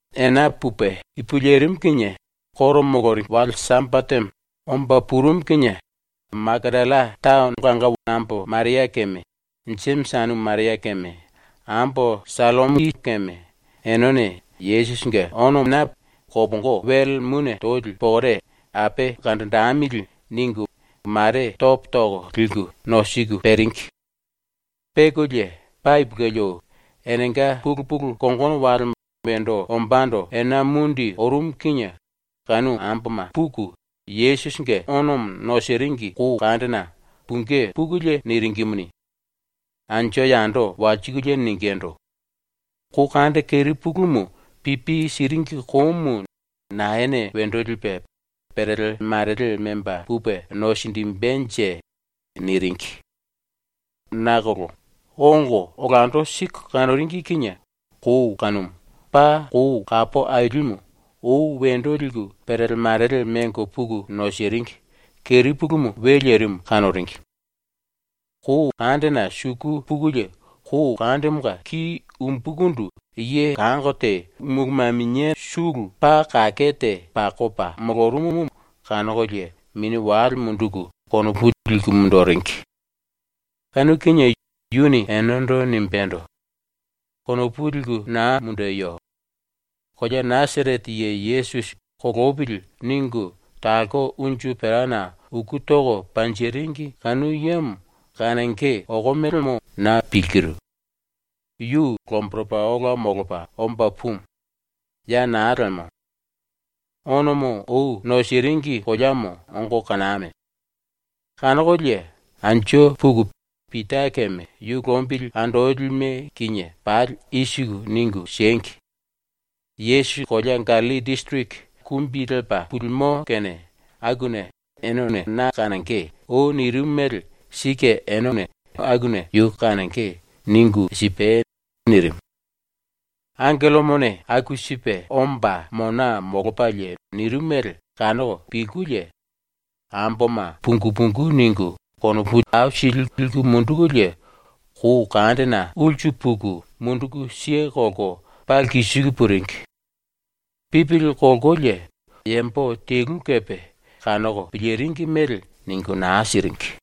Ena pupe ipu lerimu kinie ⸤Juda yambomanga koro moloringi⸥ wale Sambatemo omba purumu kinie Makatalla taono ambo Maria keme Jemisi anumu Maria keme ambo Sallomi keme enene ‘Yesusinge onona kopongo wele mune toli pokore ape kanjinjemili.’ ningu mare topo toko liku ⸤nosiku peringi⸥. Pekolie paa ipulueli ou, enenga pulu pulu kongono walemo wendo ombando ena mundi orumu kinie kanu amboma puku ⸤Yesusinge⸥ onomo nosiringi kou kandena pungí pukulie niringimuni, anju yando walsikulie ningindu: “Kou kande kerepulumu pipi siringi koumu naene wendo lipe perele marele memba pupe nosinjimbenje?” niringi. Nakolo ongo olando siku kanoringi kinie kou kanumu, paa kou kapo ailimu, ou wendo liku perele marele mengo puku nosiringi, ⸤kerepulumu we lerimu⸥ kanoringi. Kou kandena suku pukulie kou kandemonga ki umbukundu ye kango te mulu maminia sulu paa kake te pakopa molorumumu kanokolie mini wale munduku konopu liku munduringi. Kanu kinie yuni enendo nimbendo: “Konopu liku naa mundeyo. Kolea Nasarete ye Yesusi ‘Kolopili.’ ningu talko unju perana uku toko panjiringi kanu yemo kanonge okomelemo na pilkiru. Yu lomboropa ola molopa omba pumu. Ya naa lemo. Onomo ou nosiringi koleamo ongo kaname. Kanokolie anju puku Pita keme yu lombili andolime kinie pali i siku ningu siengi: “Yesusi kolea Gallilli disiriki kumbi lepa pulimo kene akuna “Ene na kanonge.” ou nirimu mele sike ene akuna yu kanonge.” ningu sipai.” nirimu. ⸤Angellomone aku sipe omba mona molopalie nirimu mele⸥ kanoko pilkulie amboma pungu pungu ningu konopu aisili liku mundukulie kou kandena ulsu puku munduku kelko paa lkisiku puringi. Pipili kolkolie yambo telu kepe kanoko piliringi mele ningu naa siringi.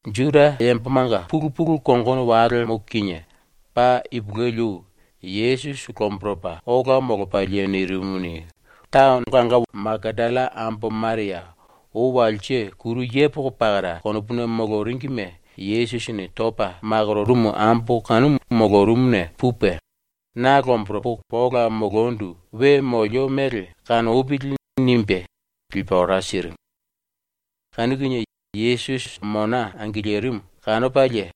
Juda yambomanga pulu pulu kongono walemo kinie, paa ipulueli ou, Yesusi lomboropa ola molopalie nirimumuni, ulke kolea Makatalla ambo Maria, ou walse kuru yepoko pakara konopuna moloringime Yesusini topa makororumu ambo kanumu molorumuna pupe ⸤‘Na lomboropo ola molondu we molio mele kanopili.’ nimbe⸥ lipe ora sirimu. Kanu kinie Yesusi ⸤mona angilirimu⸥ kanopalie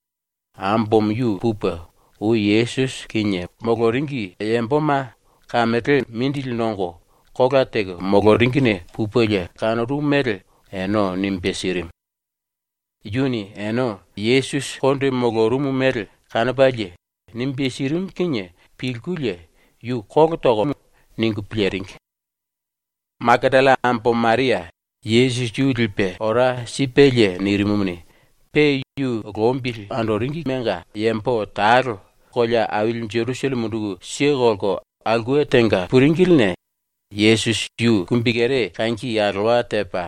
ambomo yu pupe, ou Yesusi kinie moloringi yamboma kamelena mindili nongo kola teko moloringine pupelie kanorumu mele ene nimbe sirimu. Yuni ene Yesusi konde molorumu mele kanopalie nimbe sirimu kinie pilkulie ‘Yu kolo tokomo.’ ningu piliringi. ⸤Makatalla ambo Maria Yesusi yu lipe ora sipelie nirimumuni,⸥ pe ⸤yu lombili andoringimenga⸥ yambo talo ⸤ulke kolea aili Jerusalleme munduku kelko⸥ aulke tenga puringiline Yesusi yu kumbikere kangi alowa tepa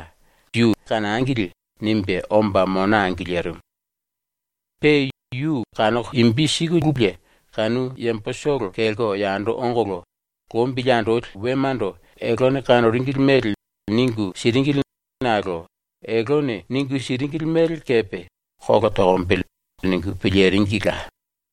‘Na kanangili.’ nimbe omba mona angilirimu. Pe yu kanoko imbi sikululie kanu yambotolo kelko yando ongolo ⸤lombili andoli⸥ wemando eltene kanoringili mele ningu siringili nakolo eltene ningu siringili mele kepe ‘Kolo tokombele.’ ningu piliringila.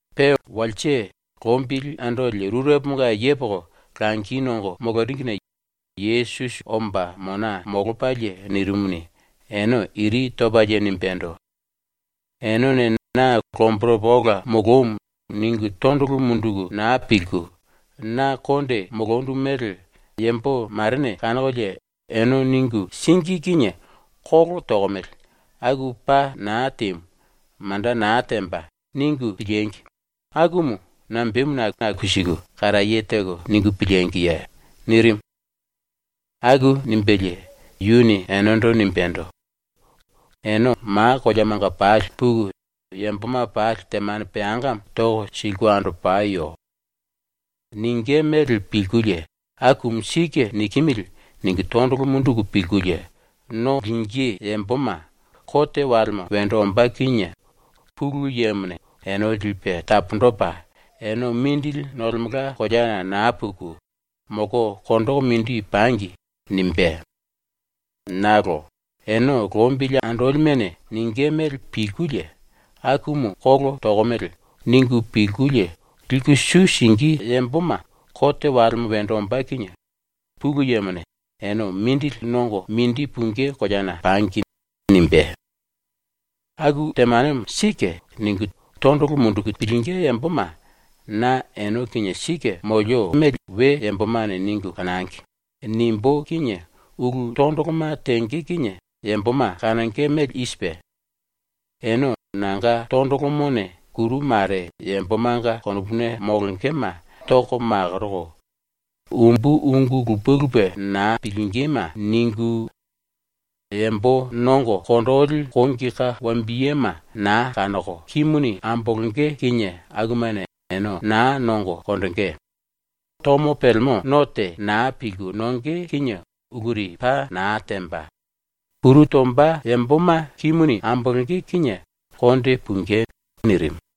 Pe walse lombili andoli rureponga yepoko langi nongo moloringine Yesusi omba mona molopalie nirimumuni, ene iri topalie nimbendo: “Enene na ‘Lomboropa ola molomu.’ ningu tondolo munduku naa pilku, na konde molondu mele yambo marene kanokolie ene ningu síngi kinie ‘Kolo tokomele. Aku paa naa temu, manda naa temba.’ ningu piliengi, akumu nambemuna aku siku karaye teko ningu pilíngiye?” nirimu. ⸤Aku nimbelie⸥ yuni enendo nimbendo: “Ene ma koleamanga pali puku yamboma pali temane peangamo toko siliku andopayo. Ningí mele pilkulie ‘Akumu sike nikimili.’ ningu tondolo munduku pilkulie no lingí yamboma ⸤kote walemo wendo ombá kinie⸥ Pulu Yemone ene lipe taponjipe ‘Ene mindili nolemelka koleana naa puku, molko konjiku mindi pangi.’ nimbé. Nakolo ⸤ene lombili andolimene⸥ ningí mele pilkulie ‘Akumu kolo tokomele.’ ningu pilkulie liku su singí yamboma ⸤kote walemo wendo ombá kinie⸥ Pulu Yemone ‘Ene mindili nongo mindi pungí koleana pangi.’ nimbé. “‘Aku temanemo sike.’ ningu tondolo munduku pilingí yamboma ‘Na ene kinie sike molio we yambomane ningu kanangi.’ nimbú kinie ulu tondoloma tenge kinie yamboma kanonge mele i sipe: Ene nanga tondolomone kuru mare yambomanga konopuna molongema toko makoroko; umbu ungu lupe lupe naa pilingíme ningu; yambo nongo konjili kongi ka wambiyema naa kanoko kimuni ambolonge kinie akumane ene naa nongo konjingí; tomo pelemo no te naa pilku nonge kinie uluri paa naa temba; kuru tomba yamboma kimuni ambolonge kinie konde pungí.” nirimu.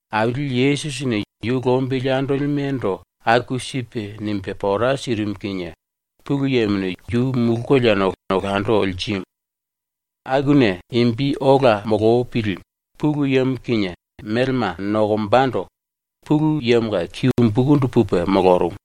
Aili Yesusini ⸤yu lombili andolime⸥ ndo aku sipe nimbe pora sirimu kinie ⸤Pulu Yemone⸥ yu mulu koleana olando lirimu. Akuna ⸤imbi ola molopili Pulu Yemo kinie melema nokombando⸥ Pulu Yemonga ki umbukundu pupe molorumu.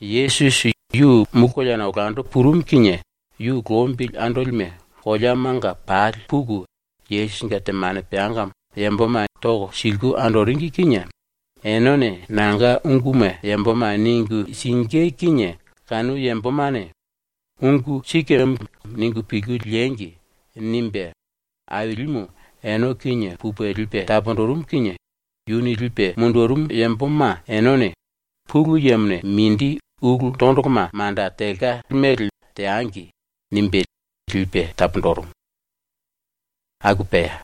Yesusi yu mulu koleana olando purumu kinie yu lombili andolime koleamanga pali puku Yesusinge temane peangamo yamboma toko siliku andoringi kinie ‘Enene nanga unguma yamboma ningu singí kinie kanu yambomane ‘Ungu sikemo.’ ningu pilku liengi.’ nimbe Ailimu ene kinie pupe lipe taponjirimu kinie yuni lipe mundurumu yamboma enene ‘Pulu Yemone mindi ulu tondoloma manda telka mele teangi.’ nimbe lipe taponjirimu. ⸤Aku pea.⸥